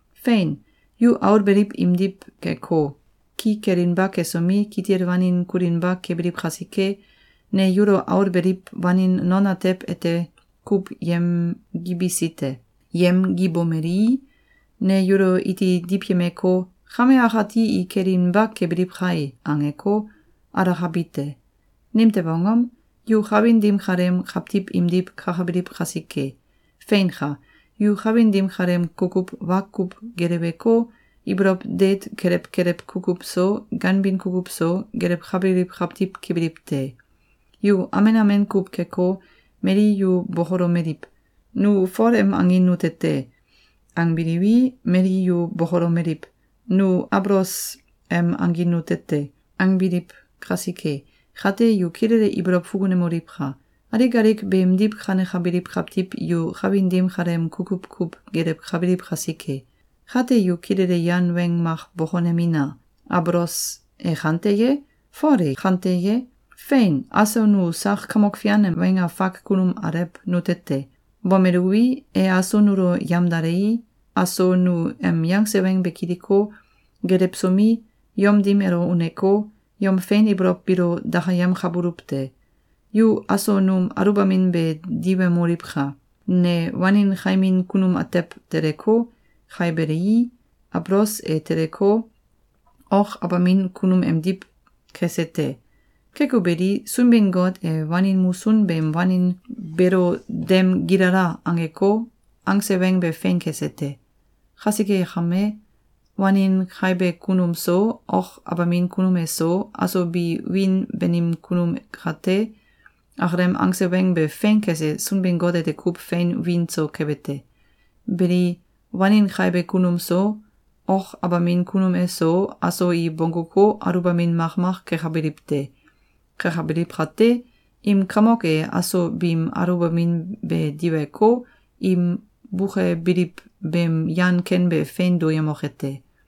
Fein! Yu aul beliw imdiw keko, ki kelinba kesomi, kitil wanin kulinba kebiliw kasike, ne yulo aul beliw wanin non atew ete kuw yemgibisi te. Yemgibomelii, ne yulo iti diwyemeko, “Kame akati ki kelinba kebiliw kai!”, angeko, alakabi te. Nimtew angom? Yu kawin dim kaleem kawtiw imdiw kakabiliw kasike. Feinka! Yu kawin dim kaleem kukuw wa kuw geleweko, ibolow deet kelew kelew kukuw so, ganbin kukuw so, gelewkabiliw kawtiw kebiliw te. Yu amen amen kuw keko, mali yu bokolomeliw: “Nu Fol em angin nute te!”, angbiliwi, mali yu bokolomeliw: “Nu Abolos em angin nute te!”, angbiliw kasike. Kate, yu kilele ibolow fukunemoliwka! Alik alik beemdiw kanekabiliw kawtiw yu kawin dim kaleem kukuw kuw gelewkabiliw kasike. Kate, yu kilele yan weng mak bokonemina! Abolos e kante ye? Fol e kante ye? Fein! Aso nu sak Kamok Fian em weng afak kunum alew nute te. Bomeluwi, e aso nulo yamdalei, aso nu em yangse weng be kiliko, gelewsomi, yom dim elo uneko, yom fein ibolow biilo dakayemkabuluw te. Yu aso num aluwbamin be diwemoliwka! Ne wanin kaimin kunum atew teleko, kaibelii, Abolos e teleko, ok abamin kunum emdiw kese te. Keko beli, Sunbin-Got e wanin musun beem wanin beelo “Dem gilala!”, angeko, angse weng be fein kese te. Kasike kame, wanin kaibe kunum so, ok abamin kunum eso, aso bi wiin banim kunum kate, akalem angse weng be fein kese Sunbin-Got ete kuw fein wiin so kebe te. Beli, wanin kaibe kunum so, ok abamin kunum eso, aso i bongguko, aluwbamin makmak kekabiliw te. Kekabiliw kate, im kamok e aso biim aluwbamin be diweko, im bukebiliw beem yan ken be fein duyemoke te.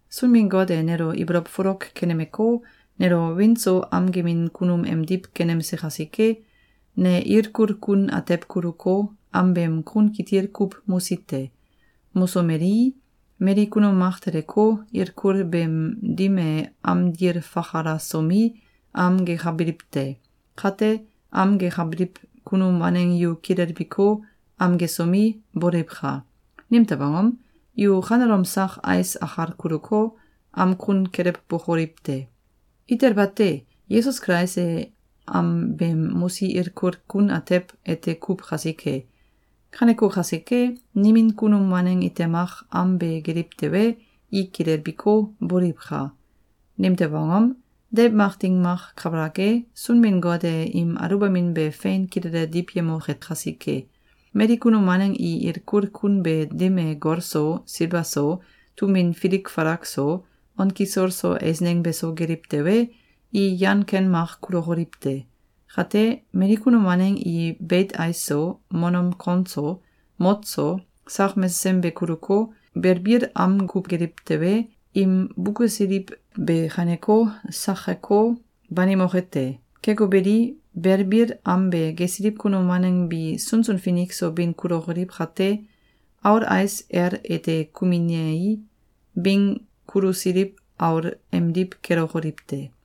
Sunbin-Got e nelo ibolow folok kenemeko, nelo wiin so am gemin kunum emdiw kenemse kasike, ne ilkul kun atew kuluko, am beem kun kitil kuw mosi te. Mosomelii, mali kunum mak teleko, ilkul beem dim e am dil fakalasomi, am gekabiliw te. Kate, am gekabiliw kunum waneng yu kilelbiko, am gesomi, boliwka! Nimtew angom? Yu kanelom sak ais akal kuluko, am kun kelewbokoliw te! Itel bate! Yesus Kulais e am beem mosi ilkul kun atew ete kuw kasike! Kaneko kasike, nimin kunum waneng ite mak am be geliw tewe, i kilelbiko, boliwka! Nimtew angom? Deiw mak ding mak kabalak e, Sunbin-Got e im aluwbamin be fein kilele diwyemoke kasike. Mali kunum waneng i ilkul kun beem dim e gol so, silba so, tum win filik falak so, on kisol so eisneng beso geliw tewe, i yan ken mak kulokoliw te. Kate, mali kunum waneng i beit ais so, monom kon so, mot so, sak mesesem be kuluko, belbil am kuw geliw tewe, im bukesiliw be kaineko, sakeko, banimoke te. Keko beli, belbil am be gesiliw kunum waneng bi sunsun finik so bin kulokoliw kate, aul ais el ete kuminei, bing kulusiliw aul emdiw kelokoliw te.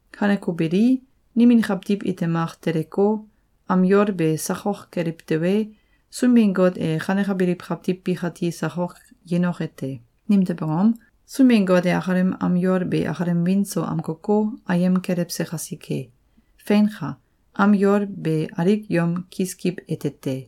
Kaneko beli, nimin kawtiw ite mak teleko, am yol be sakok keliw tewe, Sunbin-Got e kanekabiliw kawtiw bikati sakok yenoke te. Nimtew angom? Sunbin-Got e akalem am yol be akalem wiin so amkoko, ayem kelewse kasike. Feinka! Am yol be alik yom kiskiw ete te.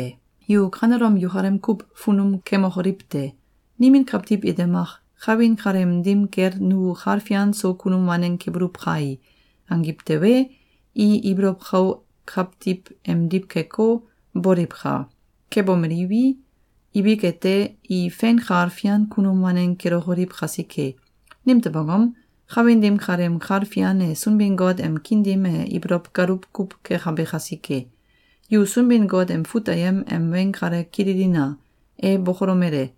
Yu kanelom yukalem kuw funum kemokoliw te! Nimin kawtiw ite mak “Kawin kaleem dim kel nu kal fian so kunum waneng kebuluw kai!”, angiw tewe, i ibolow kau kawtiw emdiw keko, boliwka! Kebomeliwi, ibik ete, i fein kal fian kunum waneng kelokoliw kasike. Nimtew angom? Kawin dim kaleem kal fian e Sunbin-Got em kiin dim e ibolow galuw kuw kekabe kasike. Yu Sunbin-Got em fut ayem em weng kale kililina! E bokolomele: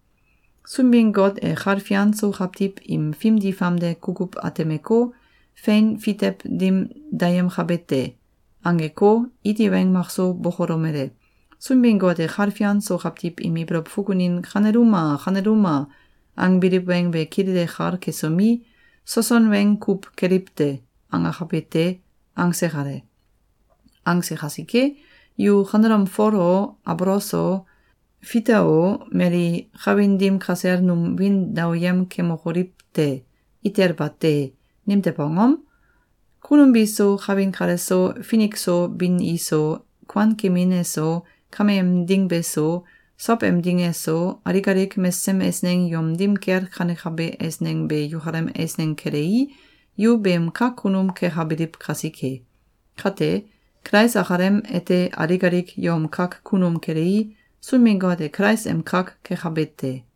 “Sunbin-Got e kal fian so kawtiw im fimdi famde kukuw atemeko, fein fitew dim dayemkabe te.”, angeko, iti weng makso bokolomele: “Sunbin-Got e kal fian so kawtiw im ibolow fukunin ‘Kaneluma! Kaneluma!’, angbiliw weng be kilele kal kesomi, ‘Soson weng kuw keliw te!’, angakabe te.”, angse kale. Angse kasike, yu kanelom Fol o, Abolos o, Fita o, mali kawin dim kasel num wiin daoyem kemokoliw te! Itel bate! Nimtew angom? Kunum biso, kawin kaleso, finik so bin iso, kuankemin eso, kameem ding beso, sow em ding eso, alik alik mesesem eisneng yom dim kel kanekabe eisneng be yukalem eisneng kelei, yu beem kak kunum kekabiliw kasike. Kate, Kulais akalem ete alik alik yom kak kunum kelei, Sunbin-Got e Kulais em kak kekabe te.